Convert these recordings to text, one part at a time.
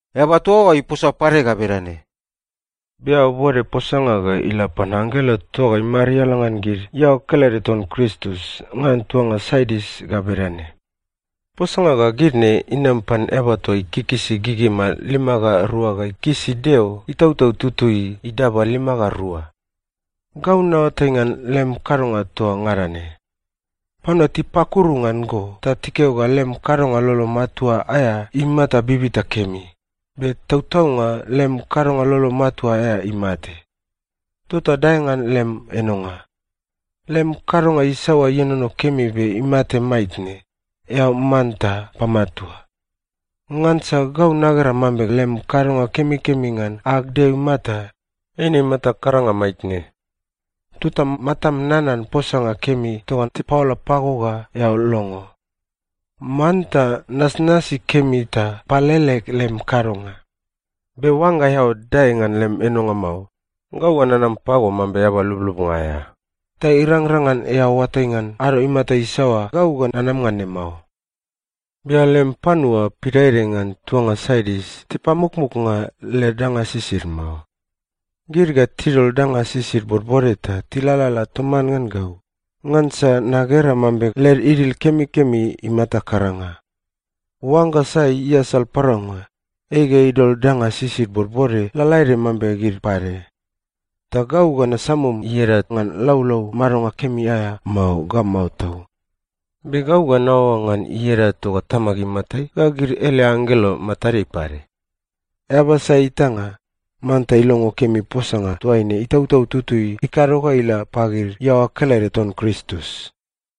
Eaba toa oa iposa pade ga bedane, “Be eao bode posanga ga ila pan anggelo toa imariala ngan gid iaoa kelede ton Kristus ngan tuanga Sardis ga bedane: Posanga ga gid ne inam pan Eaba toa ikikisi gigima lima ga rua ga ikikisi Deo Itautau Tutui toa idaba lima ga rua. Gau naoatai ngan lem kadonga toa ngada ne. Panua tipakuru ngan go ta tikeo ga lem kadonga lolo matua aea imata bibita kemi, be tautaunga lem kadonga lolo matua aea imate. Tota dae ngan lem enonga! Lem kadonga isaoa ienono kemi be imate maitne, eao manta pamatua! Ngansa gau nagera mambe lem kadonga kemikemi ngan ag Deo imata, eine imata karanga maitne. Tota matam nanan posanga kemi toa tipaola pago ga eao longo. Manta nasnasi kemi ta palele lem kadonga. Be oangga eao dae ngan lem enonga mao, gau ga nanam pago mambe eaba lublubnga aea, ta irangrang ngan eao oatai ngan ado imata isaoa gau ga nanama ngan ne mao. Be eao lem panua pidaede ngan tuanga Sardis tipamukmuknga led danga sisid mao. Gid ga tidol danga sisid bodbode ta tilalala toman ngan gau, ngansa nagera mambe led idil kemikemi imata karanga. Oangga sai iasal paraunga, ei ga idol danga sisid bodbode lalaede mambe gid pade. Ta gau ga nasamum ieda ngan laulau madonga kemi aea mao ga mao tau. Be gau ga naoaoa ngan ieda toa Tamag imatai ga gid ele anggelo matadeai pade. Eaba sai itanga, manta ilongo kemi posanga toaine Itautau Tutui ikado ga ila pagid iaoa kelede ton Kristus.”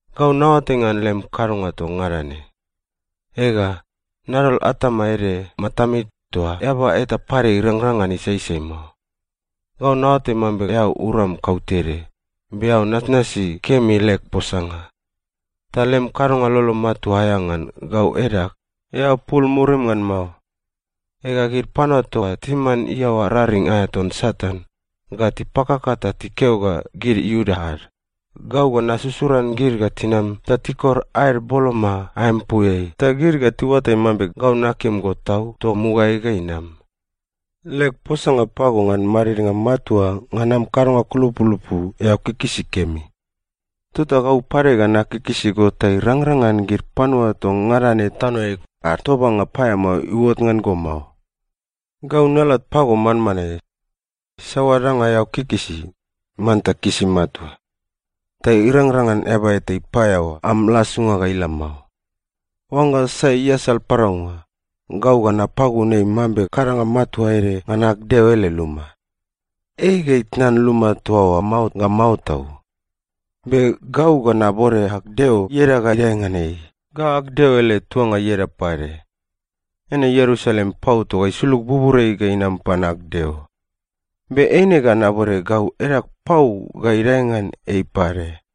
Gau naoatai ngan lem kadonga toa ngada ne. Ega, nadol atama ede matameai toa eaba eta pade irangrang ngan isaisai mao. Gau naoatai mambe eao uram kautede, be eao nasnasi kemi leg posanga. Ta lem kadonga lolo matua aea ngan gau edag, eao pul murim ngan mao. Ega, gid panua toa timan iaoa raring aea ton Satan, ga tipakaka ta tikeo ga gid Iuda ad, gau ga nasusuran gid ga tinam ta tikor aed boloma aempuiai, ta gid ga tiuatai mambe gau nakim go tau toa mugaeai ga inam. Leg posanga pago ngan madidnga matua ngan am kadonga kulupulupu, eao kikisi kemi. Tota gau pade ga nakikisi go ta irangrang ngan gid panua toa ngada ne tanoeai ad tobanga paeamao iuot ngan go mao. Gau nalat pago manmanae. Saoa danga eao kikisi, manta kisi matua. Ta irangrang ngan eaba eta ipaeaoa am lasunga ga ila mao. Oangga sai iasal paraunga, gau ga napagun ei mambe kadanga matua ede ngan ag Deo ele luma. Ei ga itnan luma toa oa mao ga mao tau. Be gau ga nabode ag Deo ieda ga idae ngan ei ga ag Deo ele tuanga ieda pade. Eine Ierusalem pau toa isulug buburiai ga inam pan ag Deo. Be eine ga nabode gau edag pau ga idae ngan ei pade.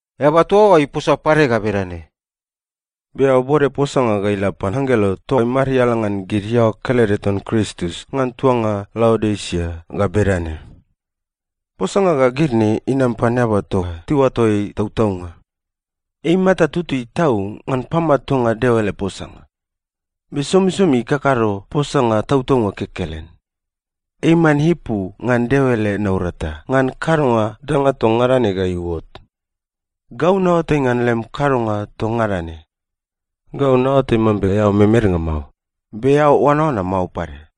Eaba toa oa iposa pade ga bedane, “Be eao bode posanga ga ila pan anggelo toa imariala ngan gid iaoa kelede ton Kristus ngan tuanga Laodisia ga bedane: Posanga ga gid ne inam pan Eaba toa tiuato ei Tautaunga. Ei imata tutui tau ngan pamatuanga Deo ele posanga. Be somisomi ikakado posanga tautaunga kekelen. Ei iman ipu ngan Deo ele naurata ngan kadonga danga toa ngada ne ga iuot. Gau naoatai ngan lem kadonga toa ngada ne. Gau naoatai mambe eao memednga mao, be eao oanaoana mao pade.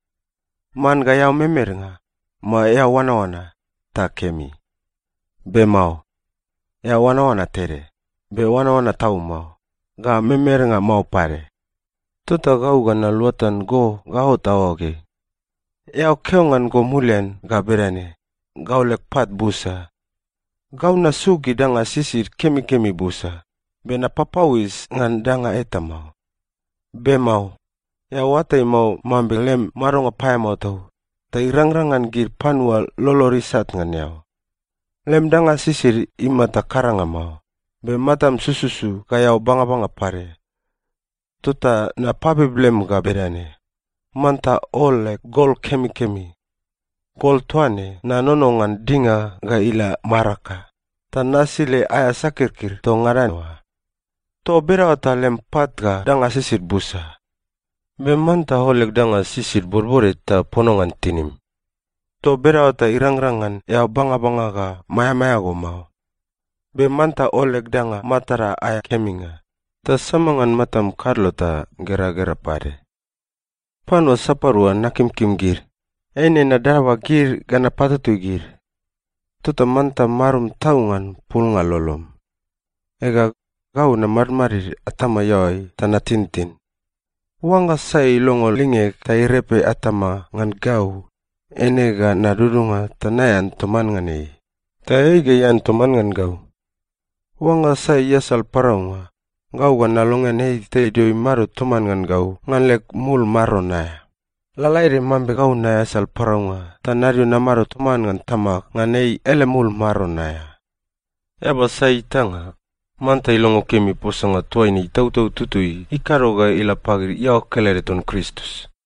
Man ga eao memednga, mao eao oanaoana, ta kemi. Be mao. Eao oanaoana tede, be oanaoana tau mao, ga memednga mao pade. Tota gau ga naluatan go ga ot aoageai. Eao keo ngan go mulian ga bedane, ‘Gau leg pat busa. Gau nasuk gid danga sisid kemikemi busa, be napapauis ngan danga eta mao.’ Be mao. Eao oatai mao mambe lem madonga paeamao tau, ta irangrang ngan gid panua lolod isat ngan eao. Lem danga sisid imata karanga mao, be matam sususu ga eao bangabanga pade. Tota napabib lem ga bedane: Manta ol leg gol kemikemi. Gol toa ne, nanono ngan dinga ga ila maraka, ta nasile aea sakirkir toa ngada oa. Toa bedaoa ta lem pat ga danga sisid busa. Be manta ol leg danga sisid bodbode ta pono ngan tinim. Toa bedaoa ta irangrang ngan eao bangabanga ga maeamaea go mao. Be manta ol leg danga matada aea keminga, ta sama ngan matam kadlo ta geragera pade. Panua sapadua nakimkim gid, eine nadaba gid ga napatutui gid. Tota manta marum tau ngan pulnga lolom. Ega, gau namadmadid atama iaoai ta natintin. Oangga sai ilongo lingeg ta irepe atama ngan gau, eine ga nadudunga ta naean toman ngan ei, ta ei ga ian toman ngan gau. Oangga sai iasal paraunga, gau ga nalongean ei ta idio imado toman ngan gau ngan leg mul maron aea, lalaede mambe gau naeasal paraunga ta nadio namado toman ngan Tamag ngan ei ele mul maron aea. Eaba sai itanga, manta ilongo kemi posanga toaine Itautau Tutui ikado ga ila pagid iaoa kelede ton Kristus.”